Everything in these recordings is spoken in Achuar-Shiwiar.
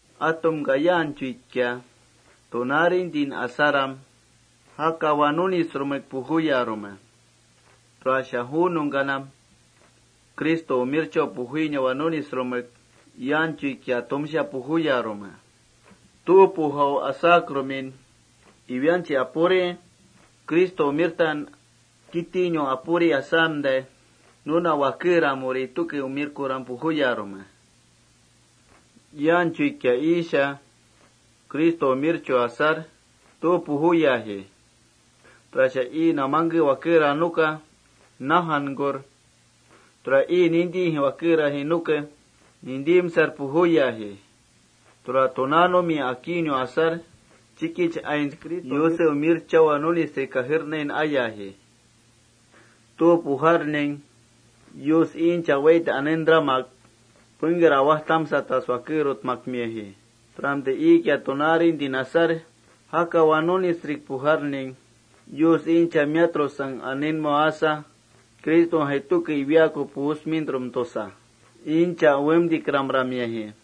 Atumka yaanchuikia tunaarintin asaram, jakawa nunisrumek pujuyarme. Tura ju nungkanam Criston umirchau ainau pujuinawa nunisrumek yaanchuikia atumsha pujuyarme. Tu pujau asaram atumsha iwianchi apuri Cristo umirtan nakitinau apuri aa nuna wakeramuri tuke umirkuram pujuyarme.+ Yaanchuikia iisha Cristo nemarchau asar tu pujuyaji, tura ii namangke wakera nuke najankur, tura ii nintijai wakeraji nuke nintimsar pujuyaji. Tura tunaanumia akiinau asar, chikich aints Yusen umirchau pujuina nunisrik pujuinau asar, Yuse kajekmauri jukitin amiaji. Tu pujarning Yus iincha wait anentramak pengker awajtamsatas wakerutmimiaji. Turamtai iikia tunaarintin asar, jakawa nunisrik pujarning, Yuska iincha miatrusang anenmau asa, Cristojai tuke iwiaaku pujusmintrum tusa, iincha uwemtikramramiaji.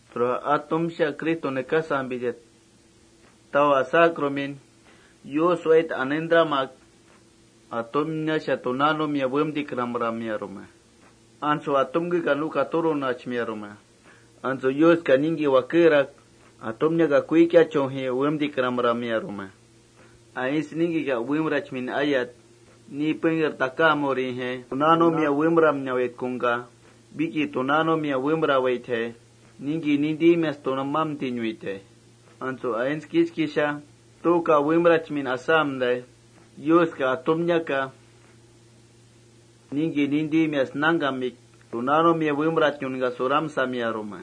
Tura atumsha Cristo nekasampita tau asakrumin, Yus wait anentramak atumniasha tunaanumia uwemtikramramiarume. Antsu atumkeka nuka turunachmiarume. Antsu Yuska ningki wakerak kuikiachujai turamiayi. Aints ningkikia uwemrachmin ayat, ni pengker takaamurijai tunaunumia uwemramnawaitkungka: Wiki tunaunumia uwemrawaitjai, tumamtinuitai. Antsu aints kichkisha tuuka uwemrachmin asamtai, Yuska atumniaka ningki wakerak tunaanumia uwemtikramramiarume.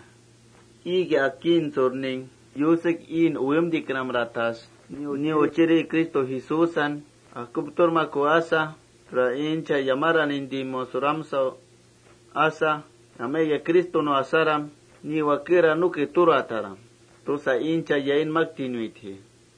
Iikia akiintsurning, Yusek iin uwemtikramratas ni Uchirin Cristo Jesúsan akupturmaku asa, tura iincha yamaram nintimaun suramsau asa: Yamaikia Cristonu asaram, pengker aa nuke turataram tusa iincha yainmaktinuitji.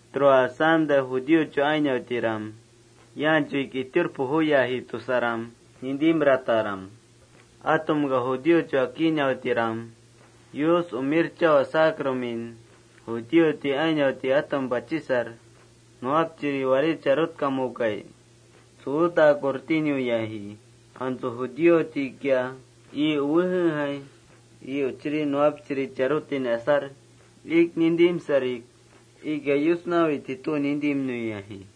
Tura asamtai judíochu ainautiram yaanchuik itiur pujuyaji tusaram nintimrataram. Judíochu akiinautiram Yuska umirchau asakrumin, judíoti ainauti atum pachisar: ¿Warí, ni nuwapchiri charutkamukai? tsuutakur tinuyaji. Antsu judíotikia ii uwejejai ii uchiri nuwapchirin charutin asar, iik nintimsarik: Iikia Yusnawaitji tu nintimnuyaji.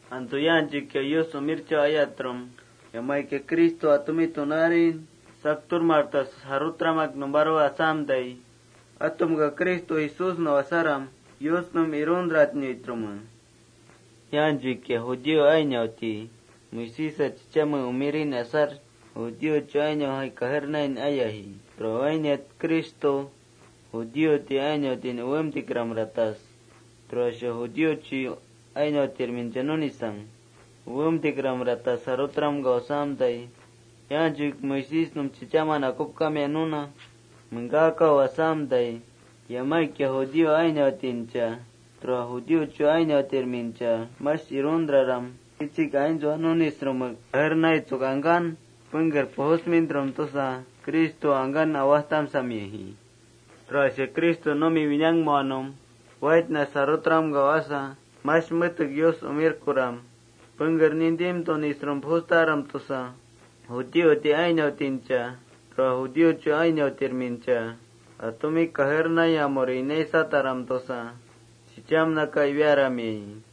Antsu yaanchuikia Yuska umirchau ayatrum, yamaikia Cristo atumi tunaarin sakturmartas jarutramak numparu asamtai, atumka Cristo Jesúsnau asaram Yusnum iruntratnuitrume. Yaanchuikia judío ainauti Moisésa chichame umirin asar, judíochu ainautirmijai kajernain armiaji. Tura wainiat Cristo judío ainautin tura judíochu ainautirmincha nunisang uwemtikramratas jarutramkamiaji. Tura asamtai Yus yaanchuik Moisésnum chichaman akupkamia nuna nangkamaku asamtai, yamaikia judío ainautincha, tura judíochu ainautirmincha: Mash iruntraram kichik aintsua nunisrumek kajernaitsuk angkan pengker pujusmintrum tusa, Cristo atumin angkan awajtamsamiarume. Tura Cristo numi winangmanum waitnas jarutramkau asa: Mash metek pengker nintimtunisrum pujustaram tusa, judío ainautincha tura judíochu ainautirmincha: Atumi kajernaiyamuri inaisataram tusa chichamnaka iwiaramiayi.+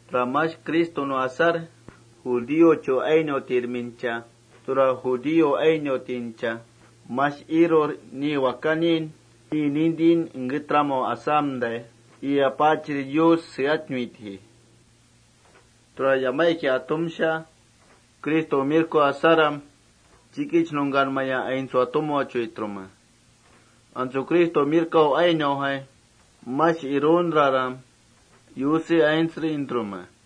Tura mash Cristonu asaram, judíochu ainautirmincha, tura judío ainautincha mash irur ni Wakanin ii nintin engketramau asamtai, ii Apaachiri Yuska seatnuitrume. Tura yamaikia atumsha Cristonu asaram, chikich nungkanmaya aintsua tumauchuitrume. Antsu Cristonu ainaujai mash iruntraram Yuse aintsrintrume.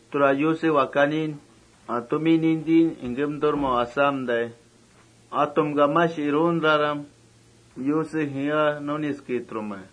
Tura Yuse Wakani atumi nintin engkemturmau asamtai, atumka mash iruntraram Yuse jeea nunisketrume.+